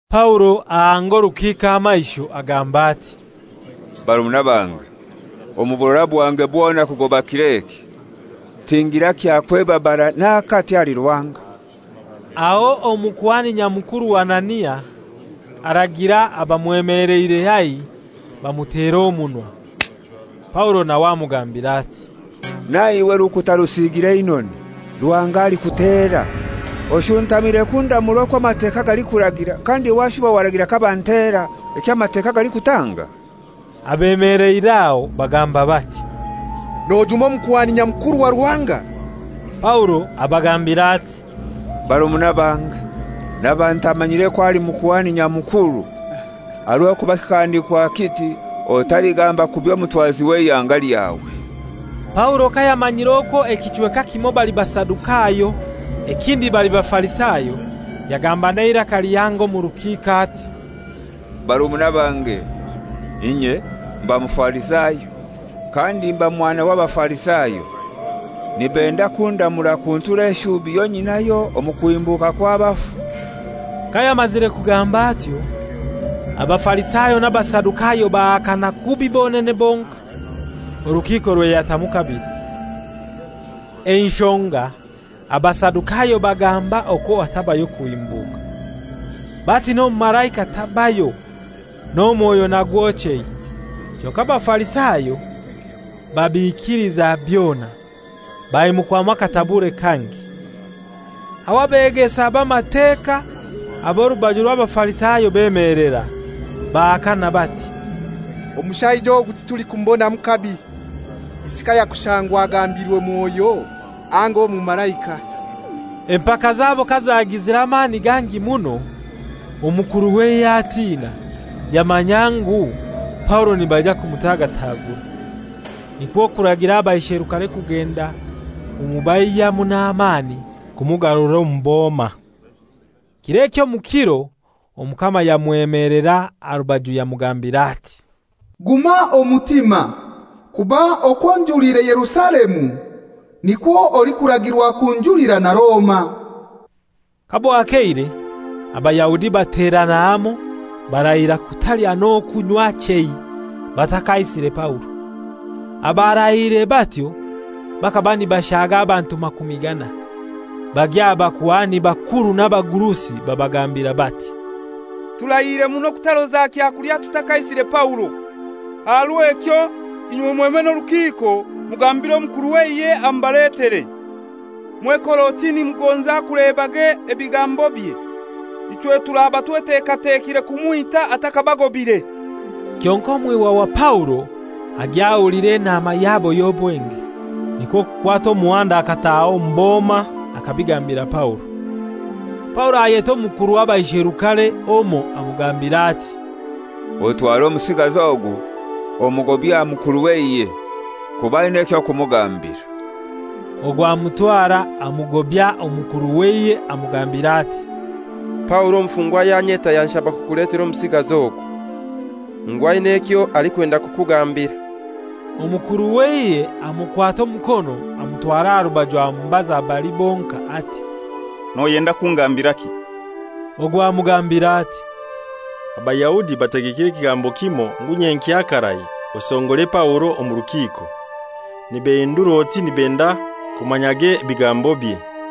Paulo ahanga orukiiko amaisho, agamba ati, «Barumuna bange, omu burora bwange bwona kugoba kir'eki, tingira kyakwebabara n'akati ahali Ruhanga.» Aho Omukuhani Nyamukuru Anania, aragira abamwemeleire haihi bamutera omunwa. Paulo nawe amugambira ati, «Naiwe, rukuta rusiigire einoni, Ruhanga alikutera! Oshuntamire kundamura okwo Amateka galikuragira, kandi washuba waragira kabantera, eky'Amateka galikutanga?» Abemeleire aho bagamba bati, «Nojuma Omukuhani Nyamukuru wa Ruhanga?» Paulo abagambira ati, «Barumuna bange, naba ntamanyire okwo ali Mukuhani Nyamukuru. Aha rw'okuba kikahandikwa kiti, ‹Otaligamba kubi omutwazi w'eihanga lyawe.›» Paulo kayamanyire okwo ekichweka ekimoi bali Basadukayo, ekindi bali Bafarisayo, yagamba n'eiraka lihango omu rukiiko ati, «Barumuna bange, inye mba Mufarisayo, kandi mba mwana w'Abafarisayo. Nibenda kundamura kuntura eshubi yonyinayo omu kuhimbuka kw'abafu.» Kayamazire kugamba atyo, Abafarisayo n'Abasadukayo bahakana kubi bonene bonkai, orukiiko rweyatamu kabili. Enshonga Abasadukayo bagamba okwo hatabayo kuhimbuka; bati n'omumalaika tabayo, n'omwoyo nagwo chei. Kyonkai Abafarisayo babiikiliza byona. Baimukwamu akatabure kangi. Aho abegesa b'Amateka ab'orubaju orw'Abafarisayo bemelera, bahakana bati, «Omushaija ogu titulikumubonamu kabi. Isi kayakushangwa agambiirwe Mwoyo anga omumalaika?» Empaka zabo kazagizire amani gangi muno, omukuru w'eihe atina, yamanya ngu Paulo nibaija kumutagatagura. Nikwo kuragira abaisherukare kugenda kumubaihyamu n'amani kumugarura omu boma. Kir'ekyo omu kiro Omukama yamwemelera aha rubaju yamugambira ati, «Guma omutima. Kuba okwo onjulire Yerusalemu, nikwo olikuragirwa kunjulira na Roma.» Kabwakeire, Abayahudi baterana hamoi barahira kutalya, n'okunywa chei, batakaisire Paulo. Abarahiire batyo bakaba nibashaga abantu makumi ganai. Bagya aha bakuhani bakuru n'abagurusi babagambira bati, «Turahiire muno kutaroza kyakulya tutakaisire Paulo. Aha rw'ekyo inywe mweme n'orukiiko mugambire omukuru w'eihe amubaletere, mwekore oti nimugonza kulebage ebigambobye. Ichwe turaba twetekatekire kumwita atakabagobaire.» Kyonkai mwihwa wa Paulo agya ahulira enaama yabo y'obwenge. Nikwo kukwata omuhanda akataaha omu boma akabigambira Paulo. Paulo ayeta omukuru w'abaisherukare omoi amugambira ati, «Otware omusigazi ogu omugobye aha mukuru w'eihe. Kuba aina eky'okumugambira.» Ogu amutwara, amugobya omukuru w'eihe amugambira ati, «Paulo omufungwa yanyeta yanshaba kukuletera omusigazi ogu, ngu aina ekyo alikwenda kukugambira.» Omukuru w'eihe amukwata omukono amutwara aha rubaju amubaza bali bonkai ati, «Noyenda kungambiraki?» Ogu amugambira ati, «Abayahudi bategekire ekigambo kimoi ngu nyenkya karai osongore Paulo omu rukiiko, nibehindura oti nibenda kumanyage ebigambobye.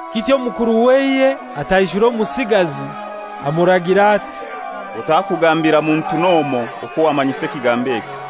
Kityo omukuru w'eihe ataishura omusigazi, amuragira ati, «Otakugambira muntu n'omoi okwo wammanyisa kigambo ekyo.»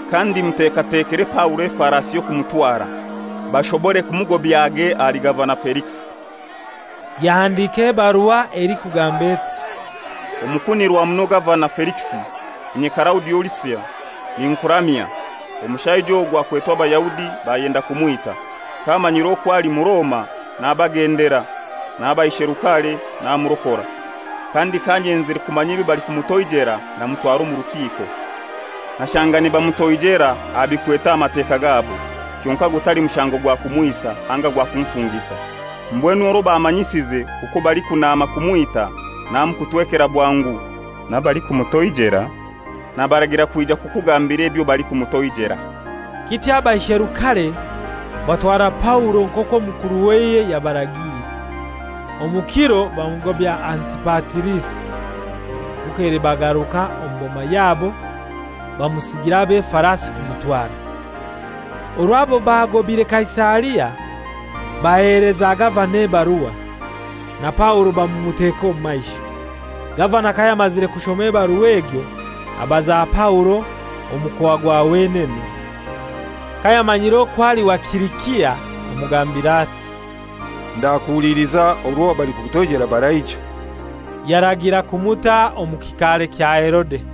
Kandi mutekatekere Paulo efarasi y'okumutwara, bashobore kumugobyage ahali Gavana elikisi.» Yahandika ebarua elikugamba eti: «Omukunirwa muno Gavana Felikisi, inye Kalaudio Lisia ninkuramya. Omushaija ogu akwetwe Abayahudi, bayenda kumwita. Kamanyire okwo ali Muroma nabagendera n'abaisherukare namurokora. Kandi kanyenzire kumanya ebyo balikumutoijela, namutwara omu rukiiko. Nashanga nibamutoijela aha bikwete Amateka gabo, kyonkai gutali mushango gwa kumwisa anga gwa kumufungisa. Mbwenu orwo bammanyisize okwo balikunnama kumwita, namukutwekera bwangu, n'abalikumutoijela nabaragira kwija kukugambira ebyo balikumutoijela.» Kityo abaisherukare batwara Paulo nk'okwo omukuru w'eihe yabaragiire. Omu kiro bamugobya Antipatirisi. Bukeire bagaruka omu boma yabo, bamusigira ab'efarasi kumutwara. Orwo abo baagobaire Kaisaria, baheleza gavana ebarua, na Paulo bamumuteka omu maisho. Gavana kayamazire kushoma ebarua egyo abaza Paulo omukoa gwa wenene. Kayamanyire okwo ali wa Silisia, amugambira ati, «Ndakuhuliliza orwo abalikukutoijera baraija.» Yaragira kumuta omu kikaare kya Herode.